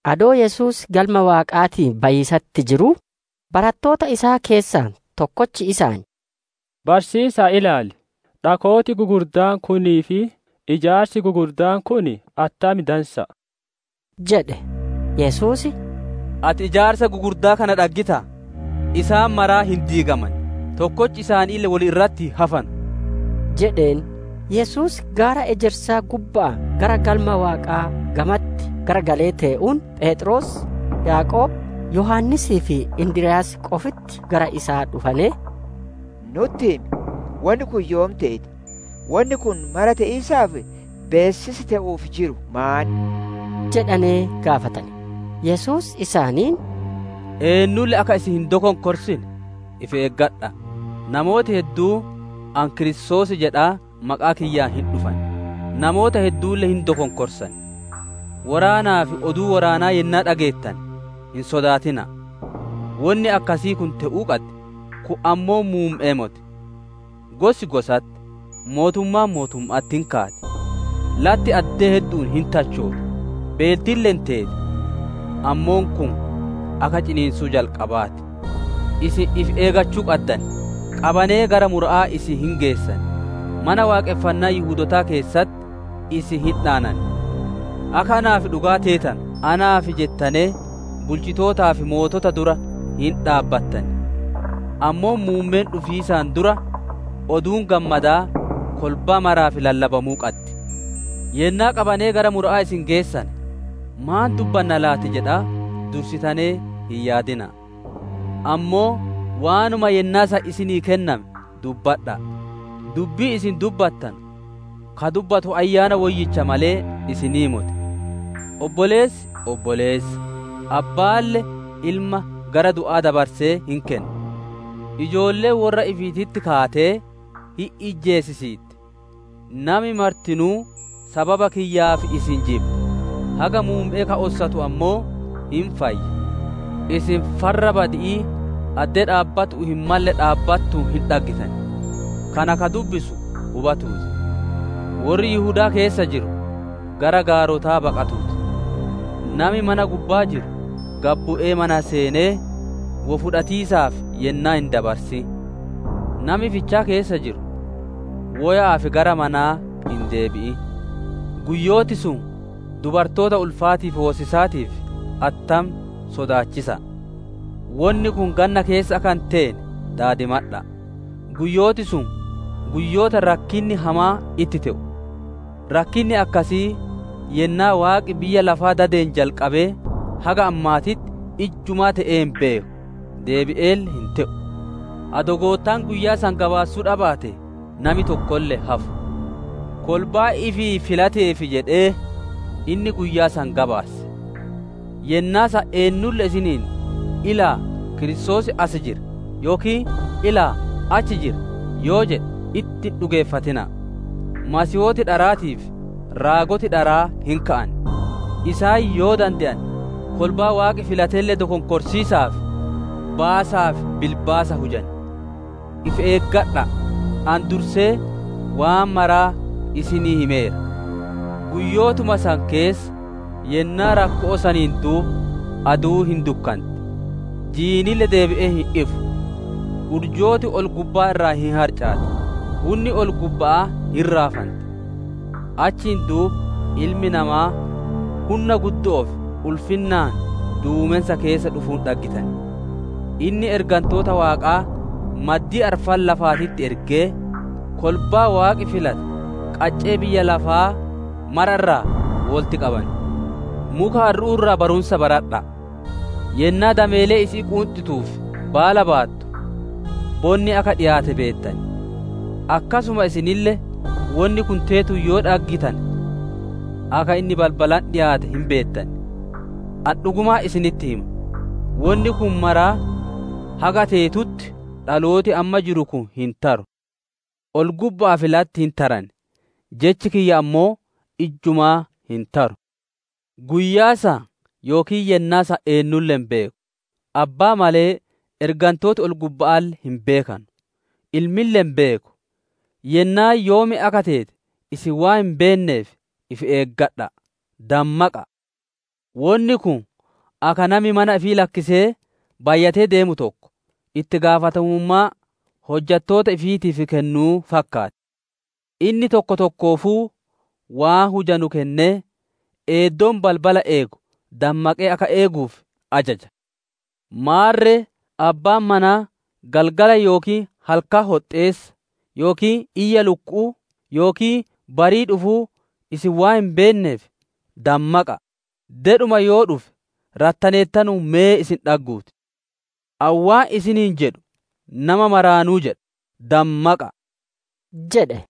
Adoo Yesuus Galma Waaqaatii bayiisatti jiruu, barattoota isaa keessaa tokkochi isaan, «Barsiisa'a, ilaali! Dhakooti gugurdaan kunii fi ijaarsi gugurdaan kun attam dansa'a!» jedhe. Yesuus, «Ati ijaarsa gugurdaa kana dhaggitaa? Isaan maraa hin diigaman; tokkochi isaaniille wol irratti hin hafanu» jedheen. Yesuus gaara Ejersaa gubba'aa gara Galma Waaqaa gamatti garagalee tee'uun Pheexroos, Yaaqoob, Yohaannisii fi Indiryaas qofitti gara isaa dhufanee, «Nutti himi, wonni kun yoom teeti? Wonni kun mara te'iisaaf beessisi te'uuf jiru maan?» jedhanee gaafatane. Yesuus isaaniin, «Eennulle akka isin hin dokonkorsine ifi eeggadha'a! Namooti hedduun, ‹Ani Kiristoos› jedhaa maqaa kiyyaan hin dhufan; namoota hedduulle hin dokonkorsan. Woraanaa fi oduu woraanaa yennaa dhageettane, hin sodaatina'a. Wonni akkasii kun te'uu qaddi; kun ammoo muumme'ee moti. Gosi gosatti, mootummaan mootumma'atti hin kaati; latti addee heddu'uun hin tachooti; beeltille hin teeti. Ammoo kun akka ciniinsuu jalqabaa ti. «Isin ifi eeggachuu qaddan. Qabanee gara mura'aa isin hin geessan; Mana Waaqonfannaa Yihudootaa keessatti isin hin dhaanan. Akka naaf dhugaa teetanu, naaf jettanee bulchitootaa fi mootota dura hin dhaabbattan. Ammoo muummeen dhufiisaan dura, Oduun Gammadaa kolbaa maraaf lallabamuu qaddi. «Yennaa qabanee gara mura'aa isin geessane, ‹Maan dubbanna laati?› jedhaa dursitanee hin yaadina'a. Ammoo waanuma yennaa san isinii kenname dubbadha'a; dubbii isin dubbattanu ka dubbatu Ayyaana Woyyicha malee isinii moti. Obboleessi obboleessa, abbaalle ilma gara du'aa dabarsee hin kenna. Ijoolleen worra ifiititti kaatee hin ijjeesisiitti. Nami martinuu sababa kiyyaaf isin jibba. Haga muumme'ee ka ossatu ammoo hin fayya. «Isin, ‹Farra badi'ii› addee dhaabbatu'uu hin malle dhaabbatuun hin dhaggittan; kana ka dubbisu hubatuu ti. Worri Yihudaa keessa jiru gara gaarotaa baqatuu ti. Nami mana gubbaa jiru, gad bu'ee mana seenee, wo fudhatiisaaf yennaa hin dabarsin. Nami fichaa keessa jiru, woya'aaf gara manaa hin deebi'in. Guyyooti sun dubartoota ulfaatii fi hoosisaatiif attam sodaachisa'a! Wonni kun ganna keessa akka hin teene daadimadha'a! Guyyooti sun guyyoota rakkinni hamaan itti te'u. Rakkinni akkasii yennaa Waaqi biyyaa lafaa dadeen jalqabee haga ammaatitti ijjumaa te'ee hin beeku. Deebi'eelle hin te'u. Adoo Goottaan guyyaa san gabaassuu dhabaatee, nami tokkolle hin hafu. Kolbaa ifii filateef jedhee, inni guyyaa san gabaasse. «Yennaa san eennulle isiniin, ‹Ilaala'a! Kiristoos as jira!› yookiin ‹Ilaala'a! Achi jira!› yoo jedhe itti hin dhugeeffatina'a. Masiihooti dharaatii fi raagoti dharaa hin ka'an. Isaan yoo dande'ane kolbaa Waaqi filatelle dokonkoriisaaf baasaa fi bilbaasa hujan. If eeggadha'a! Ani dursee waan maraa isinii himeera. «Guyyootuma san keessa, yennaa rakko'oo saniin duuba, aduun hin dukkanti; jiinille deebi'ee hin ifu. Urjooti ol-gubbaa irraa hin harcaati; hunni ol-gubba'aa hin raafanti. Achiin duuba Ilmi Namaa, hunna guddo'oo fi ulfinnaan duumensa keessa dhufuun dhaggitan. Inni ergantoota Waaqaa maddii arfan lafaatitti ergee, kolbaa Waaqi filate qaccee biyya lafaa mara irraa wolitti qaban. «Muka harru'uu irraa barumsa baradha'a. Yennaa dameeleen isi'ii quunxituu fi baala baattu, bonni akka dhiyaate beettan. Akkasuma isinille wonni kun teetuun yoo dhaggitane, akka inni balbalatti dhiyaate hin beettan. Ani dhugumaan isinitti hima; wonni kun maraa haga teetutti dhalooti amma jiru kun hin taru. Ol-gubba'aa fi latti hin taran; jechi kiyya ammoo ijjumaa hin taru. «Guyyaa san yookiin yennaa san eennulle hin beeku. Abbaa malee, ergantooti ol-gubba'aalle hin beekanu; Ilmille hin beeku. Yennaan yoom akka teete isin waan hin beenneef ifi eeggadha'a! Dammaqa'a. Wonni kun akka nami mana ifii lakkisee bayyatee deemu tokko, itti gaafatamummaa hojjatoota ifiitiif kennuu fakkaatti. Inni tokko tokkoofuu waan hujanu kennee, eeddoon balbala eegu dammaqee akka eeguuf ajaja. Maarre, abbaan manaa galgala yookiin halkan hoxxeessa, yookiin iyya lukku'uu, yookiin barii dhufuu isin waan hin beenneef dammaqa'a! Dedhuma yoo dhufe rattaneertanuun me isin dhagguu ti. Ani waan isiniin jedhu nama maraanuu jedha. Dammaqa'a!» jedhe.